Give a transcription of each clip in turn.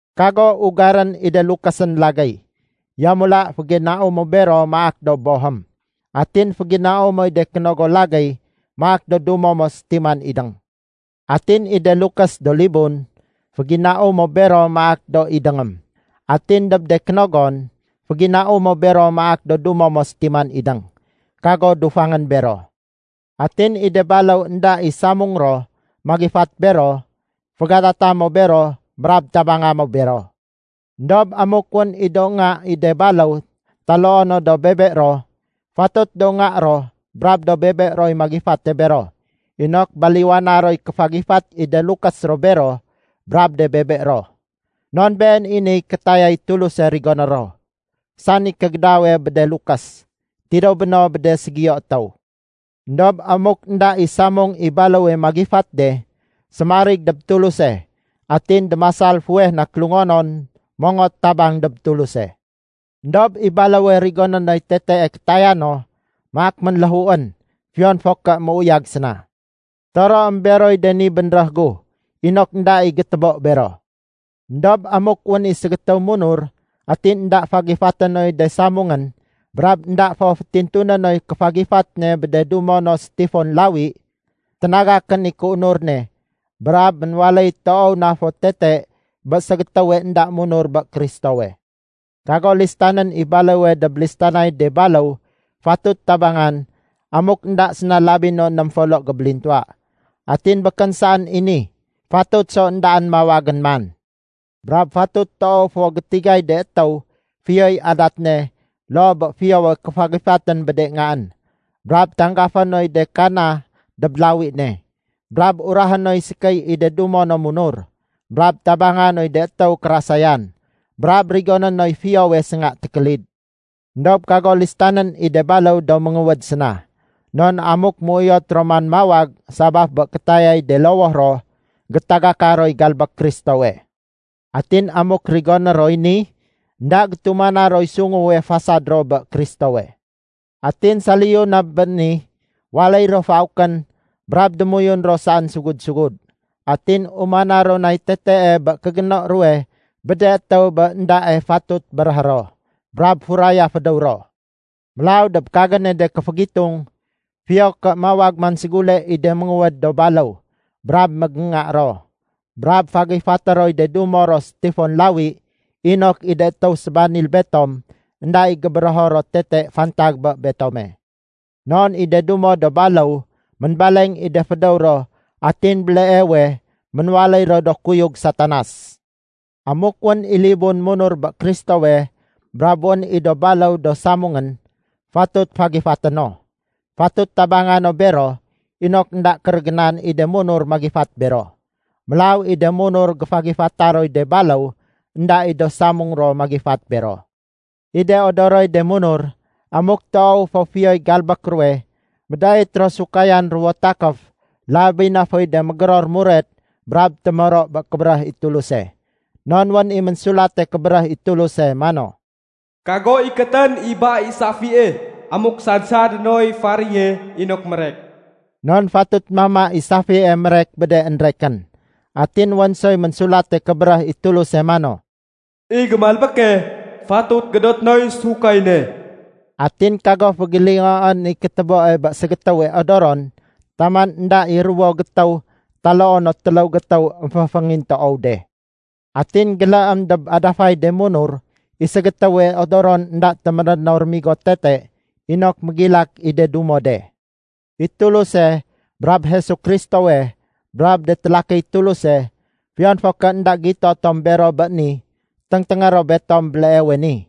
Kago ugarén i de lukésén lagéy. Yamula féginau mo bero maak do bohém. Atin féginau moy de kénogo lagéy maak do dumo mo sétiman idéng. Atin i de lukés do libun, féginau mo bero maak do idéngém. Atin dob de kénogon, féginau mo bero maak do dumo mo sétiman, idéng, kago dufangén bero. Atin i de baléw énda i samung ro magifat bero, fégadata mo bero brab tabanga mo bero. Endob amuk wén i do nga i de baléw taloo no do bebe ro, fatut do nga ro brab do bebe roy magifate bero inok baliwana roy kéfagifat i de lukés ro bero brab de bebe ro. Non been i niy kétayay Tuluse rigoné ro, sani kégédawe bé de lukés, tidéw béno bé de ségiyo étéw. Endob amuk énda i samung i baléwe magifat de, sémarig dob Tuluse atin démasal fuweh na kélungonon mongot tabang dob Tuluse. Endob i baléwe rigoné noy tetee kétaya no, maak ménléhuén fiyon fo ké méuyag séna. Toroém beroy de ni bénréh gu inok énda i gétébo bero. Endob amuk wén i ségétéw munur atin énda fagifaté noy de samungén brab énda fo fétintuné noy kéfagifat ne bé de dumo no sétifon lawi, ténagakén i kéunur ne brab ménwaléy toow na fo tete bé ségétéwe énda munur bé Kristowe. Kago listanén i baléwe dob listanay de baléw fatut tabangan amuk énda séna labi no ném folo gébélintuwa. Atin békén saén i ni, fatut so éndaén mawagén man. Brab fatut toow fo gétigay de étéw fiyoy adat ne loo bé fiyowe kéfagifatén bé de ngaén, brab tanggafé noy de kana dob lawi ne, brab urahé noy sékéy i de dumo no munur, brab tabanga noy de étéw kérasayan, brab rigoné noy fiyowe sénga tékélid. Endob kago listanén i de baléw do ménguwéd séna. Non amuk méuyot ro man mawag sabaf bé kétayay de lowoh ro, gétagaka roy galbék Kristowe. Atin amuk rigoné roy ni, énda gétumana roy sunguwe fasad ro bé Kristowe. Atin saliyu na bé ni, waléy ro faukén brab démoyun ro saén sugud-sugud. Atin umana ro nay tetee bé kégéno ruwe bé de étéw bé éndae fatut béréhé ro, brab furaya fédéw ro. Mélaw dob kagéne de kéfégitung, fiyo ké mawag man ségule i de ménguwéd do baléw brab mégénga ro, brab fagifaté roy de dumo ro sétifon lawi inok i de étéw sébanil betom énda i gébérého ro tete fantag bé betome. Non i de dumo do baléw ménbaleng i de fédéw ro atin béleewe ménwaléy ro do kuyug Satanas. Amuk wén i libun munur bé Kristowe brab wén i do baléw do samungén, fatut fagifaté no. Fatut tabanga no bero inok énda kérégénan i de munur magifat bero. Mélaw i de munur géfagifata roy de baléw énda i do samung ro magifat bero. I de odoroy de munur, amuk toow fo fiyoy galbék ruwe, médait ro sémahud ruwo takéf, labi na foy de mégéror muret brab témoro bé kébéréh i Tuluse. Non wén i Ménsulate Kébéréh i Tuluse mano, “Kago ikétén i ba i safie amuk sad-sadé noy faréye inok mérek.” Non fatut mama i safie mérek bé de énrekén. Atin wén soy Ménsulate Kébéréh i Tuluse mano, “I gémalbéke, fatut gédoté noy sahud ne.” Atin kago fégélingoén i kétéboe bé ségétéwe odoron taman énda i ruwo gétéw taloo no téléw gétéw émféféngintoow de. Atin géléém dob adafay de munur i ségétéwe odoron énda téméréno rémigo tete inok mégilak i de dumo de. I Tuluse brab Jesu Kristowe brab de télakiy Tuluse, fiyon fo ké énda gito tom bero béni, téngténgé ro betom béleewe ni.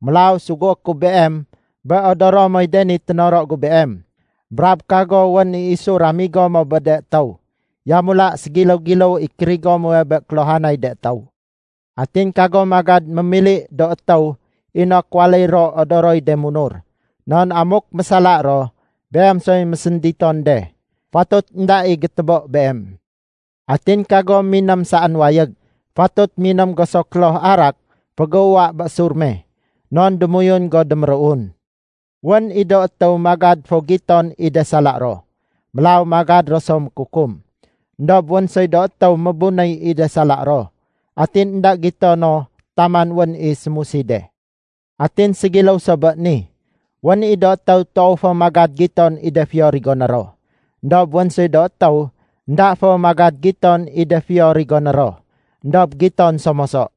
Mélaw sugué ku beem bé odoro moy de ni ténoro gu beem. Brab kago wén i isu ramigo mo bé de étéw. Yamula ségiléw-giléw i kérigo muwe bé kéluhanay de étéw. Atin kago magad mémili do étéw inok waléy ro odoroy de munur. Non amuk mésala ro, beem soy mésénditon de. Fatut énda i gétébo beem. Atin kago miném saén wayég. Fatut miném go so kloh arak fégéuwa bé sur me, non démoyun go déméruun. Wén i do étéw magad fo giton i de sala ro, mélaw magad ro so mékukum. Endob wén soy do étéw mébunéy i de sala ro atin énda gito no taman wén i sémusi de. Atin ségiléw so bé ni, wén i do étéw toow fo magad giton i de fiyo rigoné ro. Endob wén soy do étéw énda fo magad giton i de fiyo rigoné ro, éndob giton so moso.